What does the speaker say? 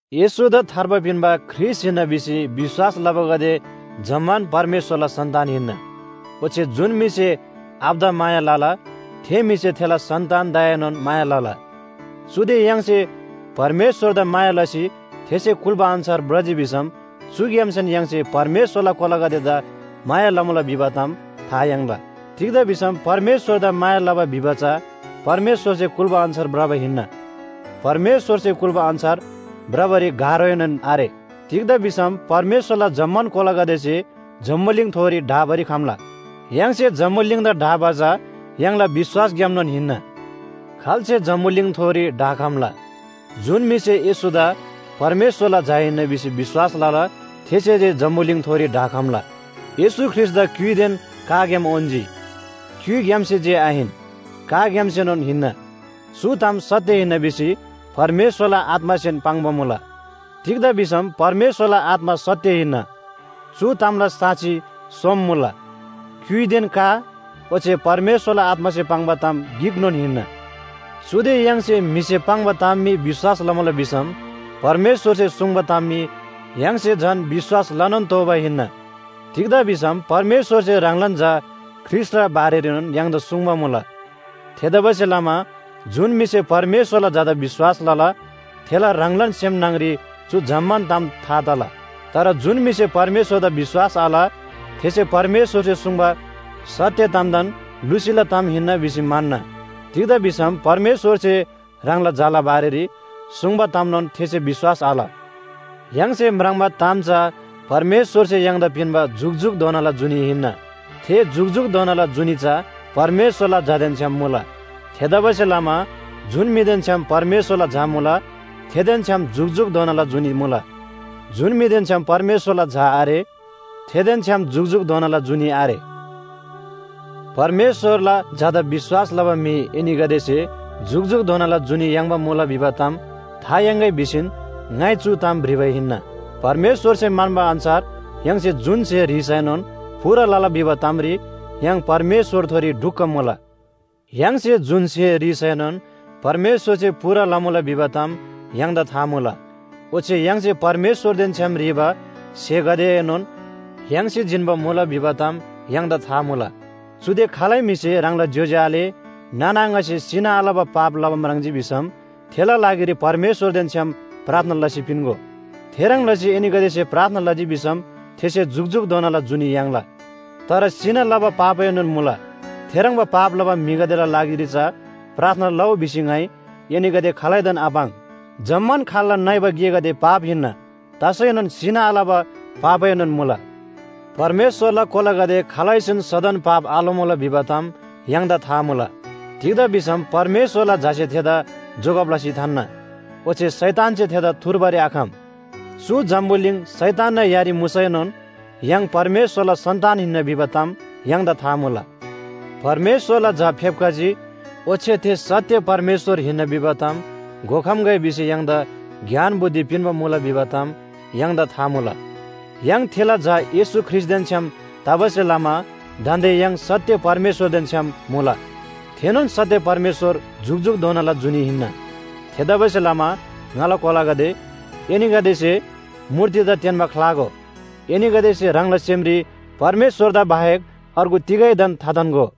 येशूदा थार्बा पिन्‍बा ख्रीष्‍ट हिन्‍ना भिसी विश्‍वास लबागदे जम्‍मान परमेश्‍वरला सन्‍तान हिन्‍ना। ओच्‍छे जुन म्‍हिसे आबादा माया लला, थे म्‍हिसे थेला सन्‍तानदाएनोन माया लला। चुदे य्‍हाङसे परमेश्‍वरदा माया लसी थेसे कुल्‍बा अन्‍छार भ्रजी भिसम चुग्‍यामसेन य्‍हाङसे परमेश्‍वरला कोलागदेदा माया लमुला भिबा ताम था याङ्ला। तिग्‍दा भिसम परमेश्‍वरदा माया लबा भिबा चा परमेश्‍वरसे कुल्‍बा अन्‍छार भ्रबा हिन्‍ना। परमेश्‍वरसे कुल्‍बा अन्‍छार भ्रबारी गाह्रोएनोन आरे। तिग्‍दा भिसम परमेश्‍वरला जम्‍मान कोलागदेसे जम्‍बुलिङथोरी ढाबारी खम्‍ला। य्‍हाङसे जम्‍बुलिङदा ढाबा चा य्‍हाङला विश्‍वासग्‍यामनोन हिन्‍ना। खाल्‍से जम्‍बुलिङथोरी ढाखम्‍ला? जुन म्‍हिसे येशूदा परमेश्‍वरला झा हिन्‍ना भिसी विश्‍वास लला, थेसे जे जम्‍बुलिङथोरी ढाखम्‍ला। येशू ख्रीष्‍टदा क्‍युइदेन काग्‍याम उन्‍जी। क्‍युइग्‍यामसे जे आहिन, काग्‍यामसेनोन हिन्‍ना। चु ताम सत्‍य हिन्‍ना भिसी परमेश्‍वरला आत्‍मासेन पाङ्बा मुला, तिग्‍दा भिसम परमेश्‍वरला आत्‍मा सत्‍य हिन्‍ना। चु तामला साक्षी सोम मुला। क्‍युइदेन का ओच्‍छे परमेश्‍वरला आत्‍मासे पाङ्बा ताम गिकनोन हिन्‍ना। चुदे य्‍हाङसे म्‍हिसे पाङ्बा ताम मी विश्‍वास लमुला भिसम परमेश्‍वरसे सुङ्बा ताम मी य्‍हाङसे झन विश्‍वास लनोन तोःबा हिन्‍ना। तिग्‍दा भिसम परमेश्‍वरसे ह्राङलान झा ख्रीष्‍टला बारेरीनोन य्‍हाङदा सुङ्बा मुला। थेतबासेलमा जुन म्‍हिसे परमेश्‍वरला झादा विश्‍वास लला, थेला ह्राङलान सेम न्‍हङरी चु जम्‍मान ताम था तला। तर जुन म्‍हिसे परमेश्‍वरदा विश्‍वास आल, थेसे परमेश्‍वरसे सुङ्बा सत्‍य तामदान लुसीला ताम हिन्‍ना भिसी म्‍हन्‍ना। तिग्‍दा भिसम परमेश्‍वरसे ह्राङला झाला बारेरी सुङ्बा तामनोन थेसे विश्‍वास आल। य्‍हाङसे म्राङ्बा ताम चा परमेश्‍वरसे य्‍हाङदा पिन्‍बा जुकजुकधोनाला जुनी हिन्‍ना। थे जुकजुकधोनाला जुनी चा परमेश्‍वरला झादेन छ्‌याम मुला। थेतबासेलमा जुन म्‍हिदेन छ्‌याम परमेश्‍वरला झा मुला, थेदेन छ्‌याम जुकजुकधोनाला जुनी मुला। जुन म्‍हिदेन छ्‌याम परमेश्‍वरला झा आरे, थेदेन छ्‌याम जुकजुकधोनाला जुनी आरे। परमेश्‍वरला झादा विश्‍वास लबा म्‍हि एनीगदेसे जुकजुकधोनाला जुनी याङ्बा मुला भिबा ताम था याङ्‌गै भिसीन ङाइ चु ताम भ्रिबा हिन्‍ना। परमेश्‍वरसे म्‍हन्‍बा अन्‍छार य्‍हाङसे जुन स्‍हे ह्रीसैनोन पूरा लला भिबा तामरी य्‍हाङ परमेश्‍वरथोरी ढुक्‍क मुला। य्‍हाङसे जुन स्‍हे ह्रीसैनोन परमेश्‍वरसे पूरा लमुला भिबा ताम य्‍हाङदा था मुला। ओच्‍छे य्‍हाङसे परमेश्‍वरदेन छ्‌याम ह्रीबा स्‍हेगदेएनोन याङ्सी जिन्‍बा मुला भिबा ताम य्‍हाङदा था मुला। चुदे खालै म्‍हिसे ह्राङला ज्‍योज्‍यो आले नाना आङासे सिना आलबा पाप लबा म्राङ्जी भिसम थेला लागिरी परमेश्‍वरदेन छ्‌याम प्रार्थना लसी पिन्‍गो। थेह्रङ् लसी एनीगदेसे प्रार्थना लजी भिसम थेसे जुकजुकधोनाला जुनी याङ्ला। तर सिना लबा पापएनोन मुला, थेह्रङ्बा पाप लबा म्‍हिगदेला लागिरी चा प्रार्थना लउ भिसी ङाइ एनीगदे खालैदान आपाङ्। जम्‍मान खाल्‍ला नइबा गेगदे पाप हिन्‍ना, तसैनोन सिना आलबा पापएनोन मुला। परमेश्‍वरला कोलागदे खालैसेन सदन पाप आलमुला भिबा ताम य्‍हाङदा था मुला। तिग्‍दा भिसम परमेश्‍वरला झासे थेदा जोगब लसी थान्‍ना, ओच्‍छे शैतानसे थेदा थुर्बारी आखम। चु जम्‍बुलिङ शैतानना यारी मुसैनोन य्‍हाङ परमेश्‍वरला सन्‍तान हिन्‍ना भिबा ताम य्‍हाङदा था मुला। परमेश्‍वरला झा फेप्‍खजी, ओच्‍छे थे सत्‍य परमेश्‍वर हिन्‍ना भिबा ताम घोखम्‍गै भिसी य्‍हाङदा ज्ञान बुद्धि पिन्‍बा मुला भिबा ताम य्‍हाङदा था मुला। य्‍हाङ थेला झा येशू ख्रीष्‍टदेन छ्‌याम तबासे लमा दान्‍दे य्‍हाङ सत्‍य परमेश्‍वरदेन छ्‌याम मुला। थेनोन सत्‍य परमेश्‍वर जुकजुकधोनाला जुनी हिन्‍ना। थेतबासेलमा ङाला कोलागदे, एनीगदेसे मूर्तिदा तेन्‍बा ख्‍लागो। एनीगदेसे ह्राङला सेमरी परमेश्‍वरदा बाहेक अर्गु तिगैदान थाथान्‍गो।